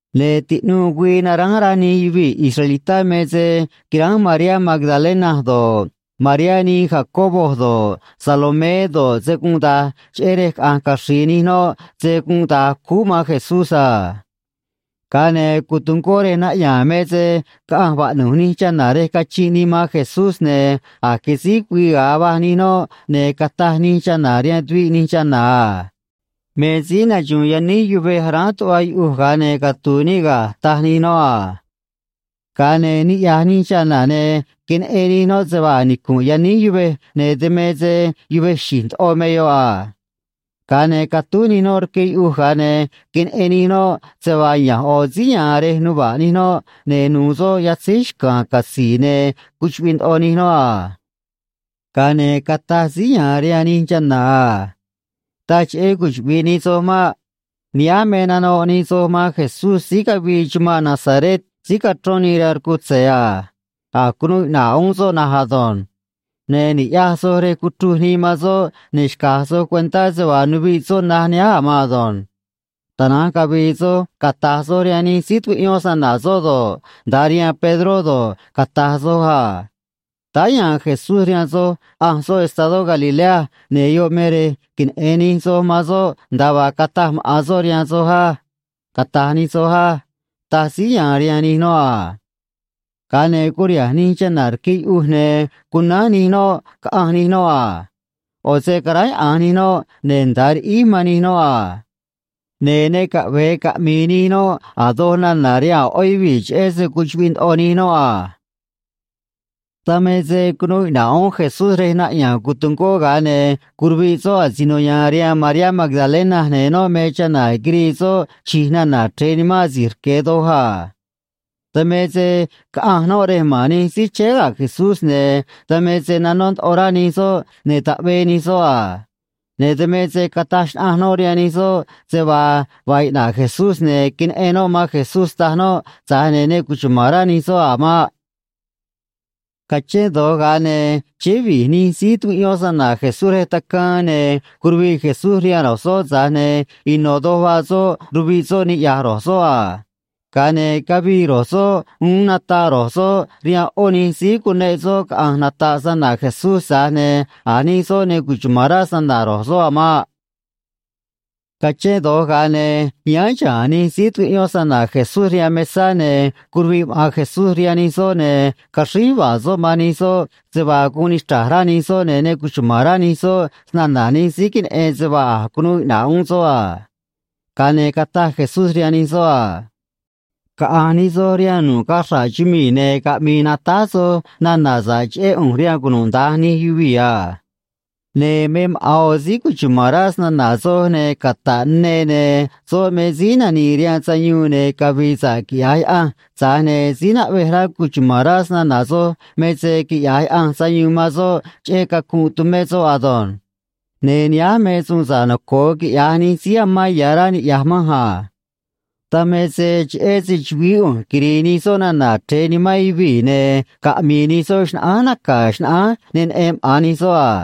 Ne̱ tiꞌnuu güii naránj rá nij yuvii̱ israelitá me se quiránj Mariá Magdalena do̱ꞌ, Mariá nii Jacobo do̱ꞌ, Salomé do̱ꞌ, se gunꞌ da̱j, cheꞌé rej caꞌa̱nj caxri̱i̱ nij noꞌ se gunꞌ da̱j cúú man Jesús a. Ga̱a ne̱ cotungó rej naꞌya̱a̱n me se caꞌanj vaꞌnu̱j nij chana̱ rej cachinꞌ nii man Jesús, ne̱ a̱j quisíj güii ga̱a va̱j nij noꞌ, ne̱ cataj nij chana̱ rihaan tuviꞌ nij chana̱ a: ―Me síí naxu̱u̱n yaníj yuvej aráán tuꞌva yuꞌuj ga̱a ne̱ catu̱u̱ níꞌ ga̱ ―taj nij noꞌ a. Ga̱a ne̱ niꞌya̱j nij chana̱, ne̱ queneꞌen nij noꞌ se vaa a̱j nicu̱nꞌ yaníj yuvej, ne̱ dan me se yuvej xi̱j ndoꞌo me yoꞌ a. Ga̱a ne̱ catúj nij noꞌ rque yuꞌuj, ga̱a ne̱ queneꞌen nij noꞌ se vaa ya̱nj ꞌo̱ síí ya̱a̱n rej nuva̱ꞌ nij noꞌ, ne̱ nuû soꞌ yatzíj xca̱a̱n catzi̱i̱, ne̱ cuchuꞌviꞌ ndoꞌo nij noꞌ a. Ga̱a ne̱ cataj síí ya̱a̱n rihaan nij chana̱ a: ―Taj cheꞌé cuchuꞌvi̱ꞌ nij soj maꞌ. Nihánj me nanoꞌ nij soj man Jesús síí cavii chumanꞌ Nazaret síí cachrón nii rihaan rcutze̱ a. A̱j cunuu iꞌna̱ꞌ uún soꞌ na̱nj ado̱nj. Ne̱ ni̱ꞌyaj soj rej cuchruj nii man soꞌ, ne̱ xca̱j soj cuentá se vaa nuviꞌ soꞌ naj nihánj a̱ mado̱nj. Tana̱nj cavi̱i̱ soj cata̱j soj rihaan nij síí tucuꞌyón snana̱ soꞌ do̱ꞌ, nda̱a rihaan Pedró do̱ꞌ, cata̱j soj a: “Táá ya̱a̱n Jesús rihaan soj ꞌanj soꞌ estadó Galilea, ne̱ yoꞌ me rej queneꞌe̱n nij soj man soꞌ nda̱a vaa cataj maꞌa̱n soꞌ rihaan soj á”, cata̱j nij soj á ―taj síí ya̱a̱n rihaan nij noꞌ a. Ga̱a ne̱ curiha̱nj nij chana̱ rque yuꞌuj, ne̱ cunánj nij noꞌ, caꞌanj nij noꞌ a. ꞌO̱ se caráyaꞌa̱nj nij noꞌ, ne̱ nda̱a riꞌíj man nij noꞌ a. Ne̱ ne caꞌve̱e caꞌmi̱i̱ nij noꞌ a̱ doj nana̱ rihaan a̱ ꞌó yuvii̱, cheꞌé se cuchuꞌviꞌ ndoꞌo nij noꞌ a. Dan me se cunuu iꞌna̱ꞌ uún Jesús rej naꞌya̱a̱n cotungó, ga̱a ne̱ curuviꞌ soꞌ asino ya̱a̱n rihaan Mariá Magdalena, ne̱ noꞌ me chana̱ quirii soꞌ chi̱j nana̱ chre̱e nimán asi̱j rque̱ doj a. Dan me se caꞌanj noꞌ rej ma̱n nij síí chéé ga̱ Jesús, ne̱ dan me se nanó ndoꞌo rá nij soꞌ, ne̱ taꞌvee nij soꞌ a. Ne̱ dan me se cataj xnaꞌanj noꞌ rihaan nij soꞌ se vaa vaa iꞌna̱ꞌ Jesús ne̱ queneꞌen noꞌ man Jesús, taj noꞌ, tza̱j ne̱ ne cuchuma̱n rá nij soꞌ a̱ maꞌ. Cachén do̱j, ga̱a ne̱ chéé vi̱j nij síí tucuꞌyón snana̱ Jesús rej tacaan, ne̱ curuviꞌ Jesús rihaan ro̱j soꞌ, tza̱j ne̱ ino̱ doj vaa soꞌ, ruviꞌ soꞌ, niꞌya̱j ro̱j soꞌ a. Ga̱a ne̱ cavii ro̱j soꞌ uún, nataꞌ ro̱j soꞌ rihaan ꞌó nij síí cuneꞌ soꞌ caꞌa̱nj nata̱ꞌ snana̱ Jesús, tza̱j ne̱ a̱ nij soꞌ ne cuchuma̱n rá snana̱ ro̱j soꞌ a̱ maꞌ. Cachén do̱j, ga̱a ne̱ yáán xa̱a̱n nij síí tucuꞌyón snana̱ Jesús rihaan mesá, ne̱ curuviꞌ maꞌa̱n Jesús rihaan nij soꞌ, ne̱ caxríj yuva̱a̱ soꞌ man nij soꞌ se vaa guun nichra̱j rá nij soꞌ ne̱ ne cuchuma̱n rá nij soꞌ snana̱ nij síí queneꞌen se vaa a̱j cunuu iꞌna̱ꞌ uún soꞌ a. Ga̱a ne̱ cataj Jesús rihaan nij soꞌ a: ―Caꞌa̱nj nij soj rihaan nu̱ꞌ cachra̱ꞌ chumii̱, ne̱ caꞌmi̱i̱ natáj soj nana̱ sa̱ꞌ cheꞌé ꞌu̱nj rihaan cunuda̱nj nij yuvii̱ a. Ne̱ me maꞌa̱n ꞌo̱ síí cuchuma̱n rá snana̱ soj ne̱ cata̱ꞌ ne, ne̱ soꞌ me síí nani̱i̱ rihaan sayuun ne̱ cavi̱i̱ sa̱ꞌ quiꞌya̱j Yaꞌanj, tza̱j ne̱ síí naꞌvej rá cuchuma̱n rá snana̱ soj me se quiꞌya̱j Yaꞌanj sayuun man soꞌ cheꞌé cacunꞌ tumé soꞌ ado̱nj. Ne̱ nihánj me suun sa̱ꞌ noco̱o quiꞌya̱j nij síí amán ya̱ rá niꞌya̱j manj a. Dan me se cheꞌé se‑chu̱vií ꞌu̱nj quiri̱i̱ nij soꞌ nana̱ chre̱e nimán yuvii̱, ne̱ caꞌmi̱i̱ nij soꞌ xnaꞌánj naca̱ xnaꞌánj ne neꞌen maꞌa̱n nij soꞌ a.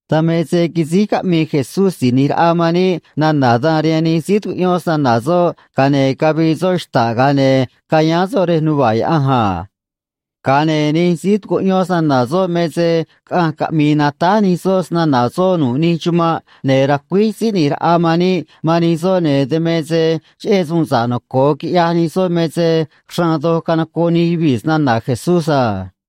Dan me se quisíj caꞌmii Jesús Si̱j ꞌNi̱j Raꞌa man níꞌ nana̱ dan rihaan nij síí tucuꞌyón snana̱ soꞌ, ga̱a ne̱ cavii soꞌ xta̱ꞌ, ga̱a ne̱ cayáán soꞌ rej nuva̱ꞌ Yaꞌanj a. Ga̱a ne̱ nij síí tucuꞌyón snana̱ soꞌ me se caꞌanj caꞌmi̱i̱ natáj nij soꞌ snana̱ soꞌ nu̱ꞌ nij chumanꞌ, ne̱ racuíj Síí ꞌNi̱j Raꞌa man níꞌ man nij soꞌ, ne̱ dan me se cheꞌé suun sa̱ꞌ noco̱o quiꞌyaj nij soꞌ me se xraan doj canocoꞌ nij yuvii̱ snana̱ Jesús a.